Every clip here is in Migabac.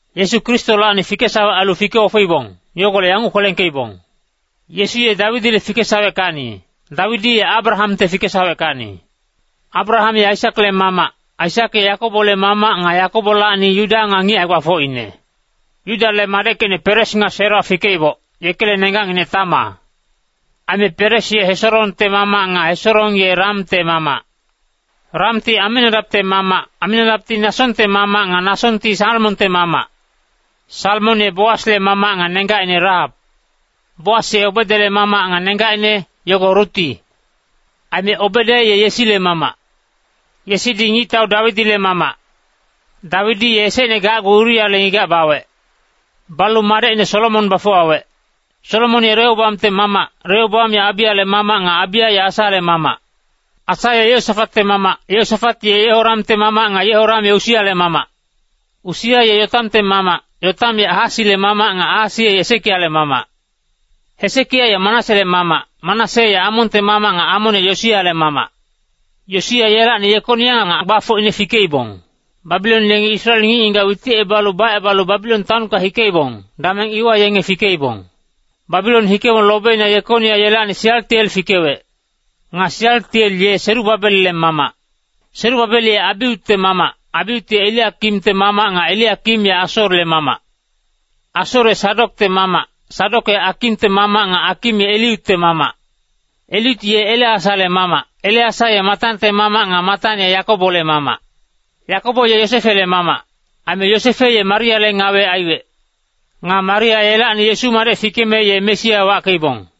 Yesu Kristolacni fikesawec ailu fike-ofeibong, yogolec yanguc kwelengkeibong. Yesu ye Dawidile fikesaweckacni, Dawidi ye Abrahamte fikesaweckacni. Abraham ye Aisakle mamac, Aisak ye Yakobole mamac nga Yakobolacni Yuda nga ngic hae-gbafocine. Yudale madeckecine Peres nga Sera fikeiboc, yekele nenggacnginec Tama. Aime Peres ye Hesorongte mamac nga Hesorong ye Ramte mamac. Ramti Aminadapte mamac, Aminadapti Nasongte mamac nga Nasonti Salmonte mamac. Salmon ye Boasle mamac nga nenggacine Rahap. Boas ye Obedele mamac nga nenggacine, yogo Ruti. Aime Obede ye Yesile mamac. Yesidi ngictau Dawidile mamac. Dawidi ye esecne gacgu Uriale ngigac bawec. Balu madecine Solomon bafuwawec. Solomon ye Rehoboamte mamac, Rehoboam ye Abiyale mamac nga Abiya ye Asale mamac. Asa ye Yehosafatte mamac, Yehosafat ye Yehoramte mamac nga Yehoram ye Usiale mamac. Usia ye Yotamte mamac, Yotam ye Ahasile mamac nga Ahasi ye Hesekiale mamac. Hesekia ye Manasele mamac, Manase ye Amonte mamac nga Amon ye Yosiale mamac. Yosia yelacni Yekonia nga gbafocine fikeibong. Babilon yengi Israel ngic-ngigac witicebalu bacebalu Babilon taonka hikeibong, dameng iwa yenge fikeibong. Babilon hikebong lobeina Yekonia yelacni Sialtiel fikewec. Nga Sialtiel ye Serubabelle mamac. Serubabel ye Abiutte mamac, Abiut ye Eliakimte mamac nga Eliakim ye Asorle mamac. Asor ye Sadokte mamac, Sadok ye Akimte mamac nga Akim ye Eliutte mamac. Eliut ye Eleasale mamac, Eleasa ye Matante mamac nga Matan ye Yakobole mamac. Yakobo ye Yosefele mamac. Aime Yosefe ye Mariale ngawe aiwec. Nga Maria yelacni Yesu madec fikeme ye Mesia wackeibong.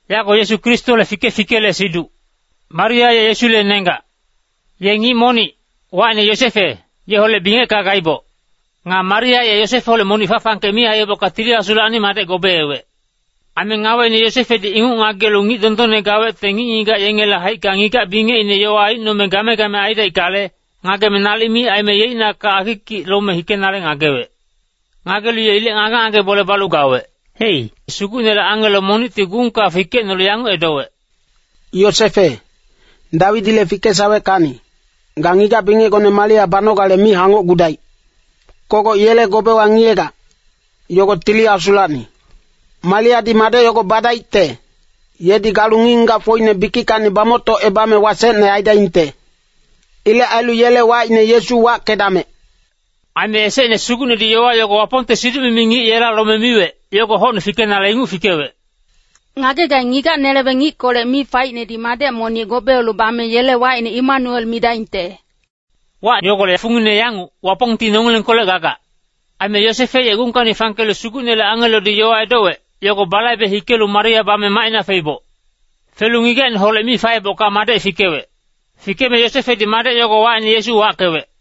Yago Yesu Kristole fike-fikele siduc. Maria ye Yesule nenggac. Ye ngic monic, wacine Yosefe, yeholec bingecka gaiboc. Nga Maria ye Yosefeholec monic fa-fangkec mi aiyebocka Tili Asulacni madec gobeewec. Aime ngaweine Yosefedi inguc ngagelu ngic dondonne gawecte ngic-ngigac yengele haicka ngigac-bingecine yowa aicnome game-game aidaickale, ngageme nalic mi aime yeicnakac akikic lome hikenale ngagewec. Ngagelu ye ilec ngage-ngage bole balu gawec. Hei, Sugucnele angelo monicti gungka fikecnolu yanguc edowec, “Yosefe, Dawidile fikesaweckacni, ga ngigac-bingecgone Maria banogale mi hangocgudaic. Kogoc yele gobewa ngiyegac, yogo Tili Asulacni. Mariadi madec yogo badaicte, yedi galu ngic-ngigacfocine bikickacni bamoctocebame wasecne aidaingte. Ilec ailu yele wacine Yesu wackedamec.” Aime esecne Sugucnedi yowa yogo Wapongte siduc-mimi ngic yela lome miwec, yogo hocne fikenale inguc fikewec. “Ngagegaing, ngigac-neleweng ngickolec mi faicnedi madec monic gobeelu bame yele wacine Emanuel midaingte.” Wac yogolec fungine yanguc: Wapongti nongilengkolec gagac. Aime Yosefe ye gungkacni fangkelu Sugucnele angelodi yowa edowec, yogo balaibe hikelu Maria bame macina feiboc. Felu ngigacineholec mi faebocka madec fikewec. Fikeme Yosefedi madec yogo wacine Yesu wackewec.